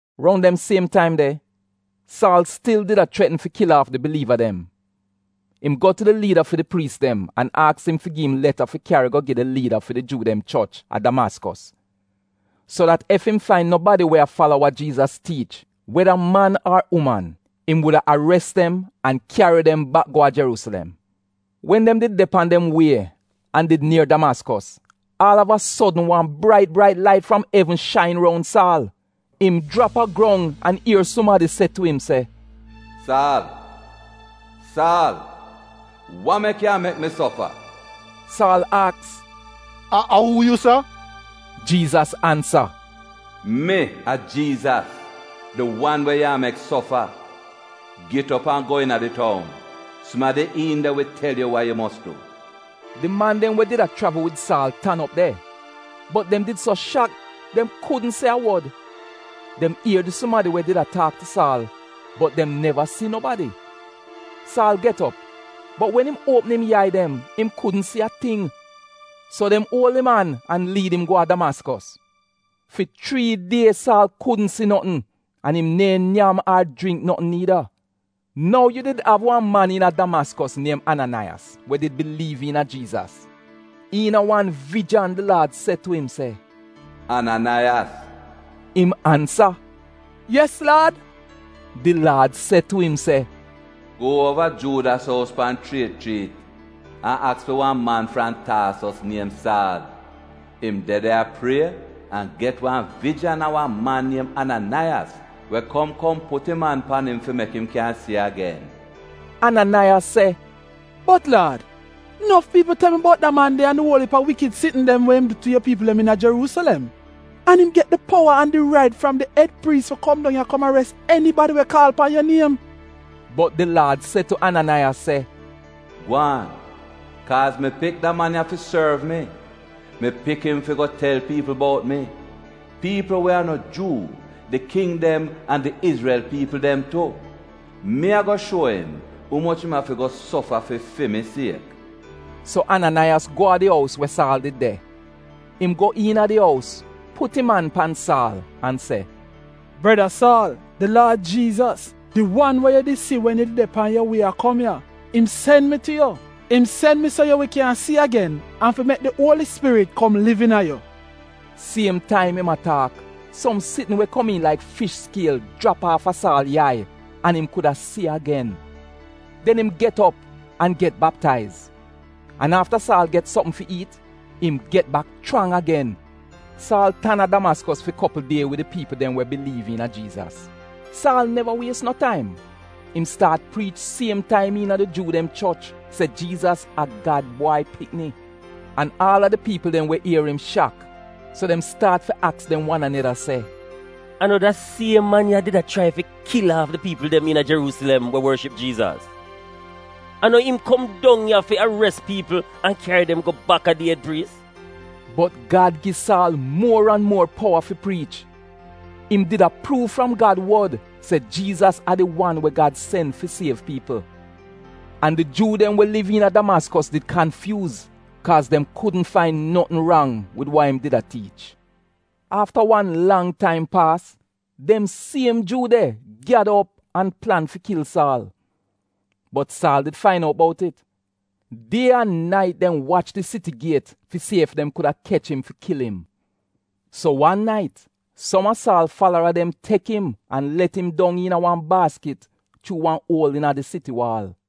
Roun dem siem taim de, Saal stil did a chretn fi kil aaf di biliiva dem. Im go tu di liida fi di priis dem an aks im fi gi im leta fi kyari go gi di liida fi di Juu dem choch a Damaskos. So dat ef im fain nobadi we a fala wa Jiizas tiich, weda man ar uman, im wuda ares dem an kyari dem bak go a Jeruusilem. Wen dem did de pan dem wie an did nier Damaskos, aal av a sodn wan brait brait lait fram evn shain roun Saal. Im jrap a grong an ier sumadi se tu im se, “Saal, Saal, wa mek yu a mek mi sofa? Saal aks, “A uu yu, Laad?” Jiizas ansa “Mi a Jiizas, di wan we yu a mek sofa.” “Git op an go iina di toun. Sumadi iin de wi tel yu wa yu mos du.” Di man dem we did a chravl wid Saal tan op de bot dem did so shak, dem kudn se a wod. Dem ier di sumadi we did a taak tu Saal, bot dem neva si nobadi. Saal get op, bot wen im uopm im yai dem im kudn si a ting. So dem uol im an an liid im go a Damaskos. Fi chrii die Saal kudn si notn an im neehn nyam ar jringk notn niida. Nou yu did av wan man iina Damaskos niem Ananaiyas we did biliiv iina Jiizas. Iina wan vijan di Laad se tu im se, “Ananaiyas!” Im ansa, “Yes, Laad.” Di Laad se tu im se, “Go uova Juudas ous pan chriet chriit an aks fi wan man fram Taasos niem Saal. Im de de a prie an get wan vijan a wan man niem Ananaiyas we kom kom put im an pan im fi mek im kyan si agen.” Ananaiyas se, “Bot Laad, nof piipl tel mi bout da man de an di uol iip a wikid sitn dem we im du tu yu piipl dem iina Jeruusilem. An im get di powa an di rait fram di ed priis fi kom dong ya kom ares enibadi we kaal pan yu niem.” Bot di Laad se tu Ananaiyas se, “Gwaan! Kaaz mi pik da man ya fi sorv mi. Mi pik im fi go tel piipl bout mi, piipl we a no Juu, di king dem an di Izrel piipl dem tu. Mi ago shuo im umoch im afi go sofa fi fi mi siek. So Ananaiyas go a di ous we Saal did de. Im go iina di ous, put im an pan Saal an se, “Breda Saal, di Laad Jiizas, di wan we yu did si wen yu did de pan yu wie a kom ya, im sen mi tu yu. Im sen mi so yu wi kyan si agen an fi mek di Uoli Spirit kom liv iina yu. Siem taim im a taak, som sitn we komiin laik fish skiel jrap aafa Saal yai an im kuda si agen. Den im get op an get baptaiz. An afta Saal get sopm fi iit, im get bak chrang agen. Saal tan a Damaskos fi kopl die wid di piipl dem we biliiv iina Jiizas. Saal neva wies no taim. Im staat priich siem taim iina di Juu dem choch se Jiizas a Gad Bwai Pikni. An aal a di piipl we ier im shak. So dem staat fi aks dem wan aneda se, “A no da siem man ya did a chrai fi kil aaf di piipl dem iina Jeruusilem we worship Jiizas? A no im kom dong ya fi ares piipl an kyari dem go baka di ed priis? Bot Gad gi Saal muor an muor powa fi priich. Im did a pruuv fram Gad wod se Jiizas a di wan we Gad sen fi siev piipl. An di Juu dem we liv iina Damaskos did kanfyuuz kaaz dem kudn fain notn rang wid wa im did a tiich. Afta wan lang taim paas dem siem Juu de gyada op an plan fi kil Saal. Bot Saal did fain out bout it. Die an nait dem wach di siti giet fi si ef dem kuda kech im fi kil im. So wan nait som a Saal falara dem tek im an let im dong iina wan baaskit chuu wan uol iina di siti waal.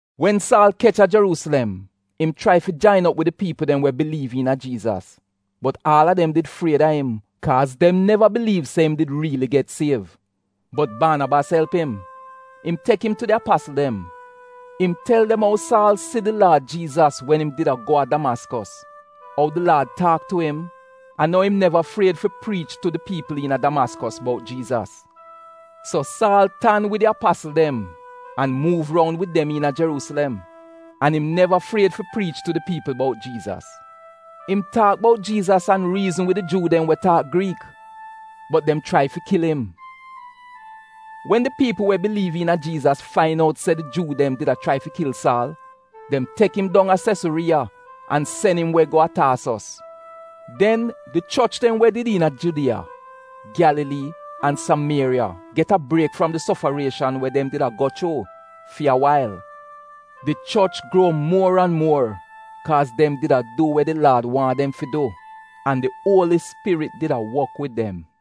Wen Saal kech a Jeruusilem, im chrai fi jain op wid di piipl dem we biliiv iina Jiizas, bot aal a dem did fried a im kaaz dem neva biliiv se im did riili get siev. Bot Baanabas elp im. Im tek im tu di apasl dem. Im tel dem ou Saal si di Laad Jiizas wen im did a go a Damaskos, ou di Laad taak tu im, an ou im neva fried fi priich tu di piipl iina Damaskos bout Jiizas. So Saal tan wid di apasl dem an muuv roun wid dem iina Jeruusilem. An im neva fried fi priich tu di piipl bout Jiizas. Im taak bout Jiizas an riizn wid di Juu dem we taak Griik. Bot dem chrai fi kil im. Wen di piipl we biliiv iina Jiizas fain out se di Juu dem did a chrai fi kil Saal, dem tek im dong a Sesuriiya an sen im we go a Taasos. Den di choch dem we did iina Judiya, Gyalalii, an Samieriya get a briek fram di sofarieshan we dem did a go chuu fi a wail. Di choch gruo muor an muor kaaz dem di a du we de Laad waahn dem fi du an di Uoli Spirit did a wok wid dem.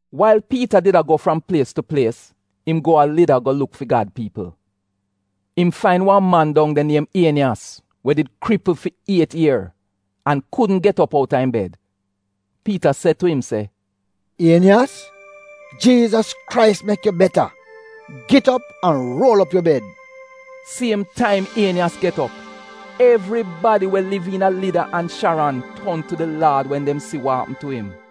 Wail Piita did a go fram plies tu plies im go a Lida go luk fi Gad piipl. Im fain wan man dong de niem Ieniyas we did kripl fi iet ier an kudn get op outa im bed. Piita se tu im se, “Ieniyas, Jiizas Krais mek yu beta! Git op an ruol op yu bed! Siem taim Ieniyas get op. Evribadi we liv iina Lida an Sharon ton tu di Laad wen dem si wa apm tu im.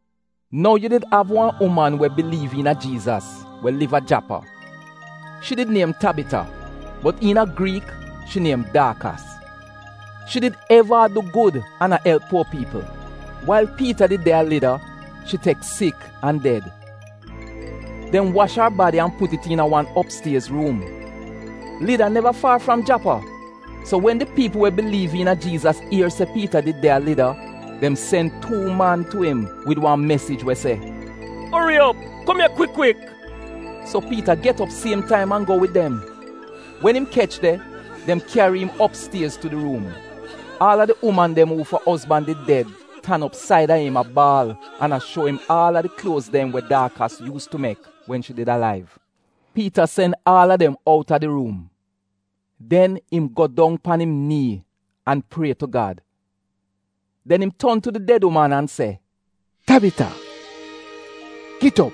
Nou yu did av wan uman we biliiv iina Jiizas we liv a Japa. Shi did niem Tabita, bot iina Griik shi niem Daakas. Shi did eva a du gud an a elp puo piipl. Wail Piita did de a Lida, shi tek sik an ded. Dem wash ar badi an put it iina wan opstiez ruum. Lida neva faar fram Japa. So wen di piipl we biliiv iina Jiizas ier se Piita did de a Lida, dem sen tuu man tu im wid wan mesij se “Ori op kum ya kwik kwik!” So Piita get op siem taim an go wid dem. Wen im kech de, dem kyari im opstiez tu di ruum. Aal a di uman dem uufa ozban did ded tan op saida im a baal an a shuo im aal a di kluoz dem we Daakas yuus tu mek wen shi did alaiv. Piita sen aal a dem outa di ruum. Den im go dong pan im nii an prie tu Gad. Den im ton tu di ded uman an se, “Tabita, git op!”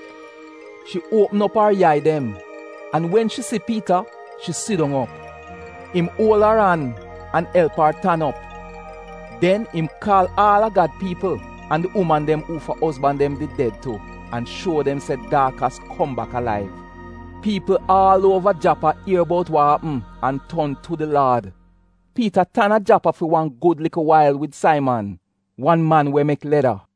Shi uopm op ar yai dem, an wen shi si Piita, shi sidong op. Im uol ar an an elp ar tan op. Den im kaal aal a Gad piipl, an di uman dem uufa ozban dem did ded tu an shuo dem se Daakas kom bak alaiv. Piipl aal uova Japa ier bout wa apm an ton tu di Laad. Piita tan a Japa fi wan gud likl wail wid Saiman, wan man we mek leda.